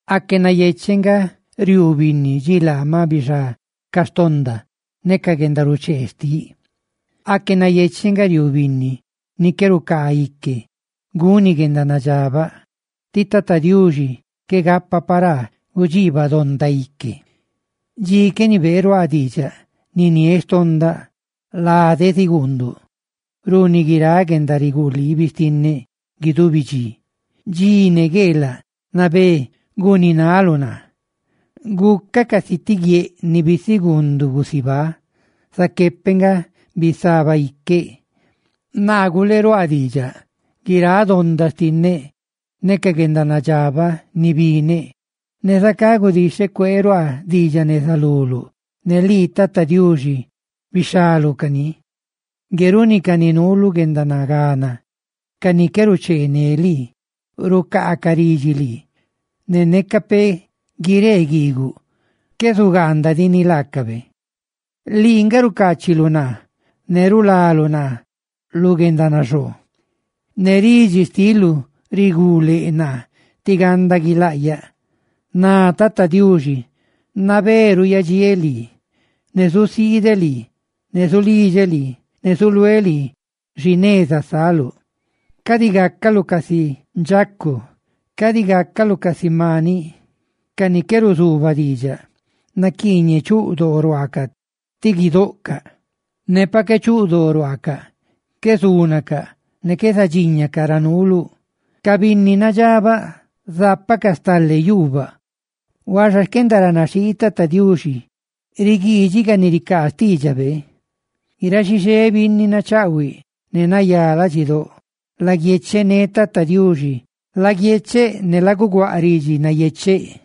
Aque nayecheꞌ nga riuu binnidxi laa ma bixá ca xtonda ne ca guendaruchee xtiꞌ. Aque nayecheꞌ nga riuu binni ni qué rucaa ique guni guendanadxabaꞌ, tí Tata Diuxi qué gapa paraa gudxiibaꞌ donda ique. Dxi qué nibeeꞌ ruaaꞌ diidxaꞌ niniéꞌ xtondaꞌ, ladeꞌ ziguundu runi guiráꞌ guendariguliibi xtinneꞌ guidubi dxi, dxi ne gueelaꞌ nabé guuninaluꞌ naa. Gucaꞌ casi ti guieꞌ ni bisiguunduꞌ gusibá, zaqué peꞌ nga bisaba iqueꞌ. Naa guleeꞌ ruaaꞌ diidxaꞌ guiráꞌ donda xtinneꞌ ne ca guendanadxabaꞌ ni bineꞌ; ne zacá gudixheꞌ cueeruaaꞌ diidxaꞌ neza luluꞌ, ne lii, Tata Diuxi, bixhaluꞌ cani. Ngue runi ca ni nuu lu guendanagana, ca ni qué ruche ne lii rucaacaꞌ ridxi lii, ne neca peꞌ guiree guiiguꞌ, qué zugaandadiꞌ ni laacabe. Lii nga rucaachiluꞌ naa; ne rulaluꞌ naa lu guendanaxoo, ne ridxi xtiluꞌ riguu leꞌ naa tí ganda guilaꞌyaꞌ. Ná Tata Diuxi: «Nabé ruuyadxiéꞌ lii. Naa zusiideꞌ lii, ne zulidxeꞌ lii, ne zuluéꞌ lii xi neza saluꞌ. Cadi gácaluꞌ casi ndxacu, cadi gácaluꞌ casi maniꞌ, ca ni qué ruzuubaꞌ diidxaꞌ; naquiiñeꞌ chuꞌ doo ruaacaꞌ ti guidoꞌcaꞌ, ne pa qué chuꞌ doo ruaacaꞌ, qué zúnacaꞌ ne qué zadxíñacaꞌ ra nuuluꞌ.» Ca binni nadxabaꞌ zápacaꞌ stale yuubaꞌ, huaxa xquendaranaxhii Tata Diuxi riguiidxini ca ni ricaa xtiidxabe. Guiráꞌ xixé binni nachaꞌhuiꞌ ne nayá ladxidóꞌ laguiechené Tata Diuxi, ¡laguiecheꞌ ne laguguaꞌ ridxi nayecheꞌ!